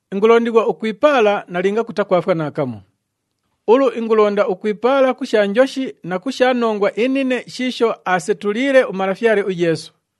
Ingulondighwa ukwipaala nalinga kutakwafwa naakamu. Ulu ingulonda ukwipaala ku sha njoshi na ku sha nongwa inine shiisho aasetuliile uMalafyale uYeesu.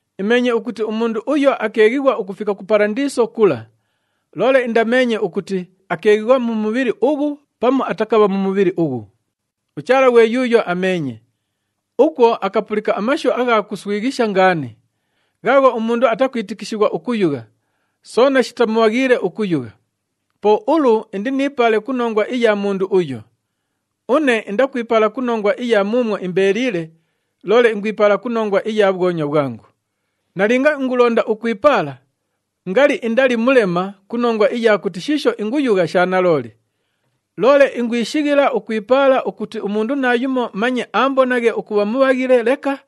Imeenye ukuti umundu uyo akeeghighwa ukufika ku Palandiiso kula. (Loole indameenye ukuti, akeeghighwa mu mubhili ughu pamu atakabha mu mubhili ughu. UChaala ghwe yuuyo ameenye.) Ukwo akapulika amashu agha kuswighisha ngaani, ghaagho umundu atakwitikishighwa ukuyugha, soona shitamubhaghiile ukuyugha. Po ulu, indiniipaale ku nongwa iya mundu uyo. Une indakwipaala ku nongwa iya muumwo imbeeliile, loole ingwipaala ku nongwa iya bhwonywa bhwangu. Nalinga ingulonda ukwipaala, ngali indali mulema ku nongwa iya kuti shiisho inguyugha sha nalooli. Loole ingwishighila ukwipaala ukuti umundu naayumo manye aambonaghe ukubha mubhaghile leka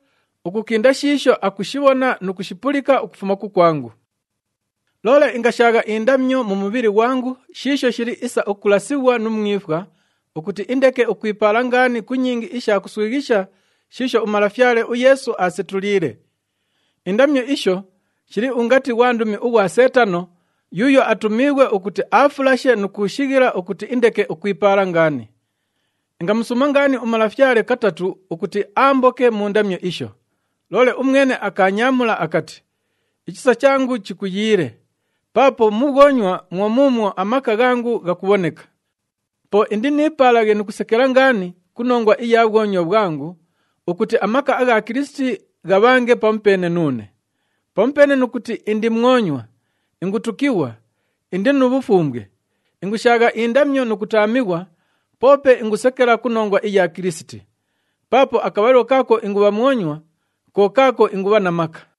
ukukinda shiisho akushibhona nu kushipulika ukufuma kukwangu. Loole ingashaagha indamyo mu mubhili ghwangu shiisho shili isa ukulasighwa nu mwifwa, ukuti indeke ukwipaala ngaani ku nyingi isha kuswighisha shiisho uMalafyale uYeesu aasetuliile. Indamyo isho shili ungati ghwandumi ughwa Seetano, yuuyo atumiighwe ukuti aafulashe nu kuushighila ukuti indeke ukwipaala ngaani. Ingamusuuma ngaani uMalafyale katatu ukuti aamboke mu ndamyo isho. Loole umwene akaanyaamula akati, “Ichisa changu chikuyiile, paapo mu bhwonywa mwo muumwo amaka ghangu ghakubhoneka.” Po indiniipaalaghe nu kusekela ngaani ku nongwa iya bhwonywa bhwangu, ukuti amaka agha Kilisiti ghabhange pamupeene nuune. Pamupeene nu kuti indi mwonywa, ingutukighwa, indi nu bhufumbwe, ingushaagha indamyo nu kutaamighwa, poope ingusekela ku nongwa iya Kilisiti. Paapo akabhalilo kaako ingubha mwonywa, ko kaako ingubha na maka.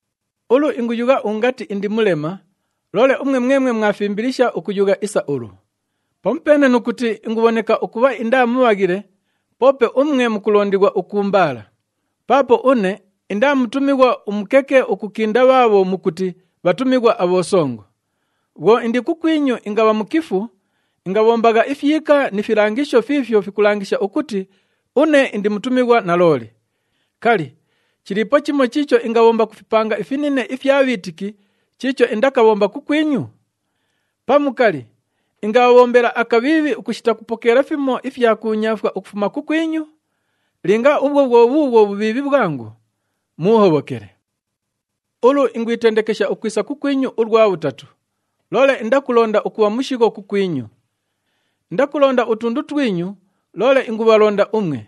Ulu, inguyugha ungati indi mulema, loole umwe mwemwe mwafimbilisha ukuyugha isa ulu. Pamupeene nu kuti ingubhoneka ukubha indaa mubhaghile, poope umwe mukulondighwa ukuumbaala. Paapo une indaa mutumighwa umukeke ukukinda bhaabho mukuti, “Bhatumighwa abhosongo.” Bhwo indi kukwinyu ingabha mukifu, ingabhombagha ifyika ni filangisho fiifyo fikulangisha ukuti une indi mutumighwa nalooli. Kali, chiliipo chimo chiicho ingabhomba ku fipanga ifinine ifya bhiitiki chiicho indakabhomba kukwinyu? Pamu, kali, ingabhabhombela akabhiibhi ukushita kupokeela fimo ifya kuunyaafwa ukufuma kukwinyu? Linga ubhwo bhwo bhuubhwo bhubhiibhi bhwangu, muuhobhokele! Ulu ingwitendekesha ukwisa kukwinyu ulwa bhutatu, loole indakulonda ukubha mushigho kukwinyu. Indakulonda utundu twinyu, loole ingubhalonda umwe.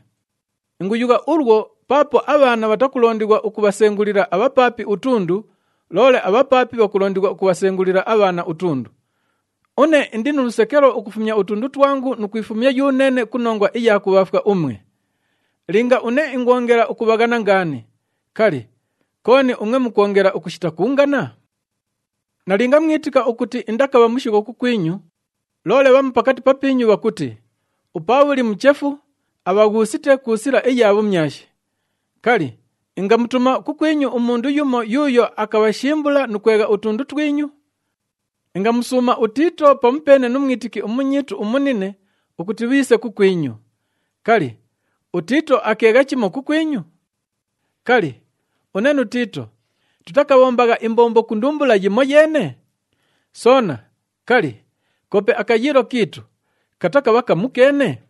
Inguyugha ulwo paapo abhaana bhatakulondighwa ukubhasengulila abhapaapi utundu, loole abhapaapi bhakulondighwa ukubhasengulila abhaana utundu. Une indi nu lusekelo ukufumya utundu twangu nu kwifumya yuneene ku nongwa iya kubhaafwa umwe. Linga une ingwongela ukubhaghana ngaani, kali, kooni umwe mukwongela ukushita kuungana? Nalinga mwitika ukuti indakabha mushigho kukwinyu, loole bhamu pakati papiinyu bhakuti, “UPaabhuli muchefu, abhaghuusite ku sila iya bhumyashi.” Kali, ingamutuma kukwinyu umundu yumo yuuyo akabhashimbula nu kwegha utundu twinyu? Ingamusuuma uTiito pamupeene nu mwitiki umunyiitu umunine ukuti bhiise kukwinyu. Kali, uTiito akeegha chimo kukwinyu? Kali, une nu Tiito tutakabhombagha imbombo ku ndumbula yimoyeene? Soona, kali, koope akayiilo kiitu katakabha kamukeene?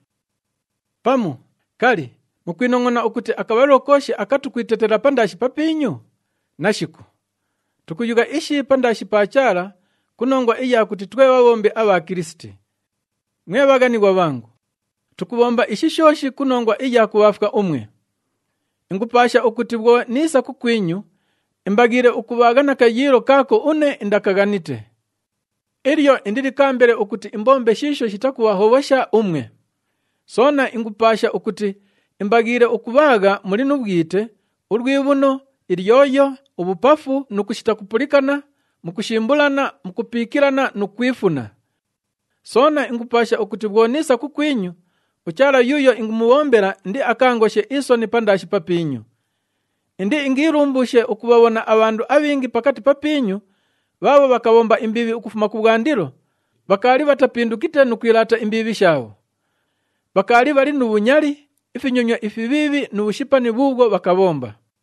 Pamu, kali, mukwinongʼona ukuti akabhalilo kooshi aka tukwitetela pandaashi papiinyu? Nashiku! Tukuyugha ishi pandaashi pa Chaala ku nongwa iya kuti twe bhabhombi abha Kilisiti. Mwe bhaghanighwa bhangu, tukubhomba ishi shooshi ku nongwa iya kubhaafwa umwe. Ingupaasha ukuti bhwo niisa kukwinyu, imbaghiile ukubhaagha na kayiilo kaako une indakaghanite. Ilyo indilikaambele ukuti imbombe shiisho shitakubhahobhosha umwe. Soona ingupaasha ukuti imbaghiile ukubhaagha muli nu bhwite, ulwibhuno, ilyoyo, ubhupafu nu kushita kupulikana, mukushimbulana, mukupiikilana nu kwifuna. Soona ingupaasha ukuti bhwo niisa kukwinyu, uChaala yuuyo ingumubhombela indiakaangoshe isoni pandaashi papiinyu. Indiingiilumbuushe ukubhabhona abhandu abhingi pakati papiinyu bhaabho bhakabhomba imbiibhi ukufuma kubhwandilo, bhakaali bhatapindukite nu kwilaata imbiibhi shaabho. Bhakaali bhali nu bhunyali, ifinyonywa ifibhiibhi nu bhushipani bhuubhwo bhakabhomba.